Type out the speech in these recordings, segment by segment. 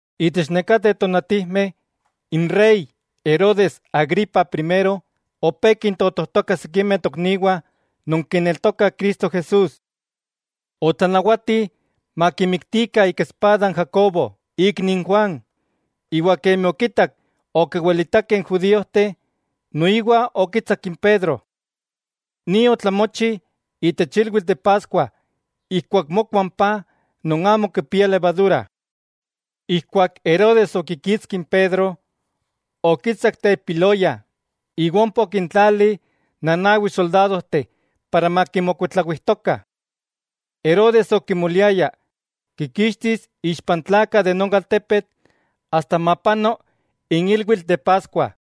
Itech nekateh tonatijmeh, n rey Herodes Agripa Primero opé kintotojtoka sikimeh tokniwah non kineltokah Cristo Jesús. Otlanawati makimiktikah ika espada n Jacobo, ikni n Juan, iwa kemi okitak okiwilitakeh n judíojteh, noiwa okitsak n Pedro. Ni otlamochi itech ilwitl de Paskua ijkuak mokua n paj non amo kipia levadura. Ijkuak Herodes okikitski n Pedro, okitsak telpiloya iwa ompa okintlali nanawi soldadojteh para makimokuitlawijtokah. Herodes okimoliaya kikixtis ixpa n tlakah de non altepetl asta mapano n ilwitl de Paskua.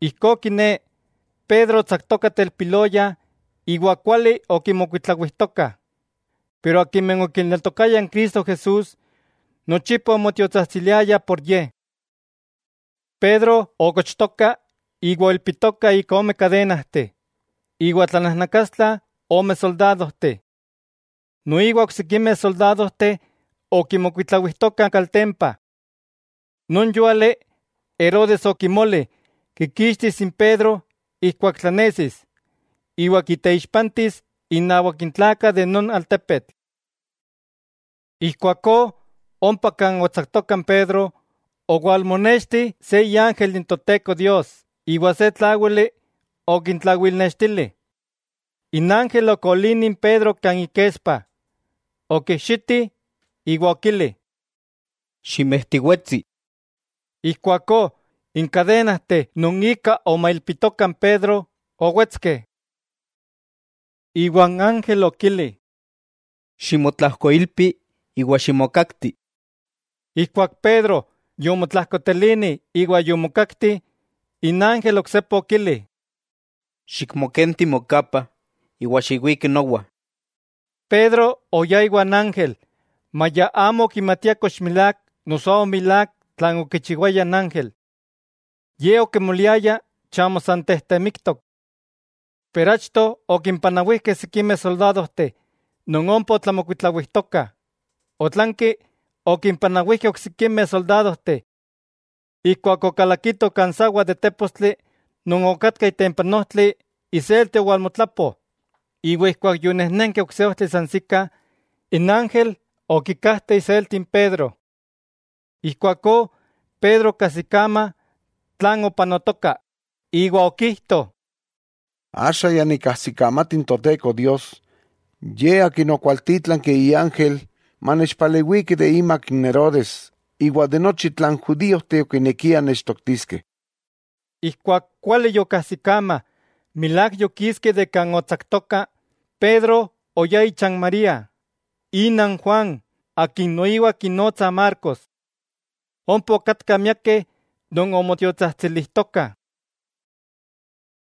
Ijkó kiné, Pedro otsaktoka telpiloya iwa kuali okimokuitlawijtokah, pero akimeh okineltokayah Cristo Jesús nochipa omotiotsajtsiliayah por ye. Pedro okochtoka iwa oilpitoka ika ome kadenajteh, iwa tlanajnakastla ome soldadojteh. Noiwa oksikimeh soldadojteh okimokuitlawijtokah kaltempa. Non yúali Herodes okimoli kikixtis n Pedro ijkuak tlanesis, iwa kiteixpantis innawak n tlakah de non altepetl. Ijkuakó ompa kan otsaktoka n Pedro owalmonexti se iángel n Toteko Dios iwa se tláwili okintlawilnextili. N ángel okolini n Pedro kan ikespa, okijxiti iwa okili: —¡Ximejtiwetsi! Ijkuakó n kadenajteh non ika omailpitoka n Pedro, owetskeh. Iwa n ángel okili: —Ximotlajkoilpi iwa ximokakti. Ijkuak Pedro yomotlajkotelini iwa yomokakti, n ángel oksepa okili: —Xikmokenti mokapa iwa xiwiki nowa. Pedro oyá iwan ángel maya amo okimatia kox milák noso amo milák tlan okichiwaya n ángel. Ye okimoliaya chamo san tejtemiktok. Pero achto okimpanawijkeh sikimeh soldadojteh non ompa otlamokuitlawijtokah, otlanki okimpanawijkeh oksikimeh soldadojteh. Ijkuak okalakitoh kan sawa de tépostli non okatka itempa n ojtli iselti owalmotlapo, iwa ijkuak yonejnenkeh ok se ojtli sansikah, n ángel okikajte iselti n Pedro. Ijkuakó Pedro okajsikama tlan opanotoka, iwa okijto: —Axa ya nikajsikamati n Toteko Dios, Ye Akin okwaltítlanki iángel, manechpalewiki imak Herodes iwa de nochi tlan judíojteh okinekiah nechtoktiskeh. Ijkuak kuali yokajsikama milák yokiski de kan otsaktoka, Pedro oyá icha n María, ina n Juan akin noiwa kinotsah Marcos. Ompa okatkah miakeh non omotiotsajtsilijtokah.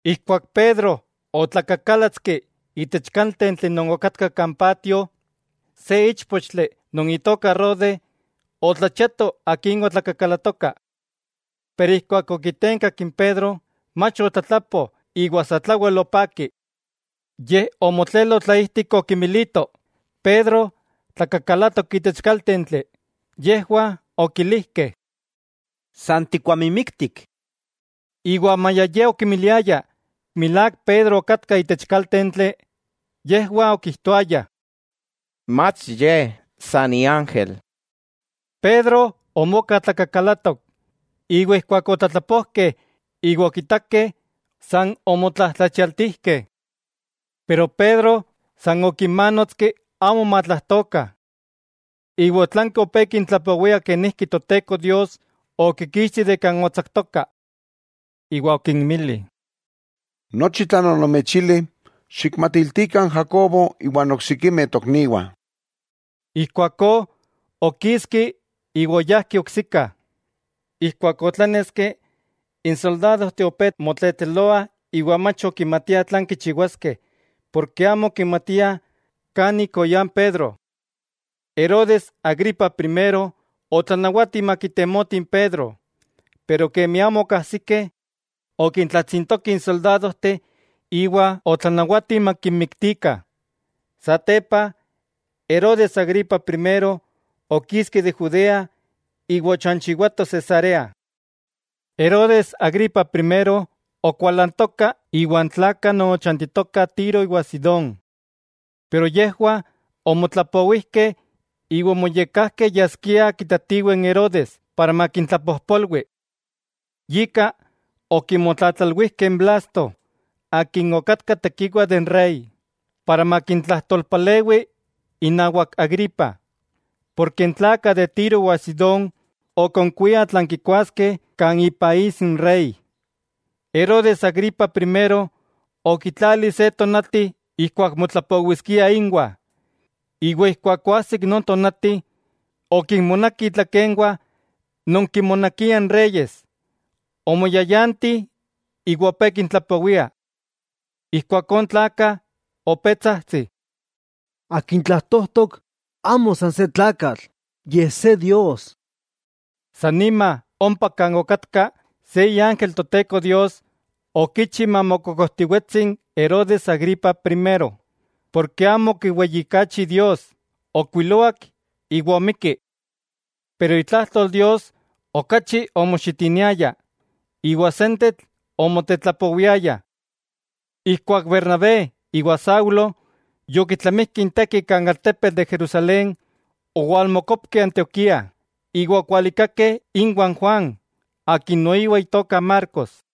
Ijkuak Pedro otlakakálatski itech kaltentli non okatka kan patio, se íchpochtli non itoka Rode otlachiato akin otlakakalatoka. Pero ijkuak okitenkak n Pedro, mach otlatlapo iwa satlawel opaki. Yej omotlelo tlaijtik okimilito, Pedro tlakakalatok itech kaltentli. Yejwah okilijkeh: —¡San tikuamimiktik! Iwa maya ye okimiliaya milák Pedro okatka itech kaltentli, yejwah okijtoayah: —Mach ye, san iángel. Pedro omoka tlakakalatok, iwa ijkuak otlatlapojkeh iwa okitakeh, san omotlajtlachialtijkeh. Pero Pedro san okimanotski amo matlajtokah. Iwa otlanki opé kintlapowia kenijki Toteko Dios okikixti de kan otsaktoka. Iwa okinmili: —Nochi tlan onomechili, xikmatiltikah n Jacobo iwa n oksikimeh tokniwah. Ijkuakó okiski iwa oyajki oksika. Ijkuak otláneski, n soldadojteh opé motletleloah iwa mach okimatiah tlan kichiwaskeh porke amo okimatiah kan ik oyá n Pedro. Herodes Agripa Primero otlanawati makitemotih n Pedro, pero kemi amo okajsikeh, okintlatsintoki n soldadojteh iwa otlanawati makinmiktikah. Satepa Herodes Agripa Primero okiski de Judea iwa ochanchiwato Cesarea. Herodes Agripa Primero okualantoka iwa n tlakah non ochantitokah Tiro iwa Sidón, pero yejwah omotlapowijkeh iwa omoyekkajkeh yaskiah kitatiweh n Herodes para makintlapojpolwi. Yika okimotlatlalwijkeh n Blasto akin okatka tekiwa de n rey, para makintlajtolpalewi inawak Agripa, porke n tlakah de Tiro iwa Sidón okonkuiah tlan kikuaskeh kan ipaís n rey. Herodes Agripa Primero okitlali se tonati ijkuak motlapowiskia inwah, iwa ijkuak oajsik non tonati, okinmonaki itlakenwah non kinmonakiah n reyes, omoyayanti iwa opé kintlapowia. Ijkuakó n tlakah opé tsajtsih: —¡Akin tlajtojtok amo san se tlakatl, yej se dios! San nima ompa kan okatka, se iángel Toteko Dios okichi mamokokojtiwetsi n Herodes Agripa Primero, porke amo okiweyijkachi Dios, ookuiloak iwa omikki. Pero itlajtol Dios okachi omoxitiniaya, iwa sentetl omotetlapowiaya. Ijkuak Bernabé iwa Saulo yokitlamijkeh inteki kan altepetl de Jerusalén, owalmokopkeh Antioquía iwa okualikakeh inwah n Juan akin noiwa itoka Marcos.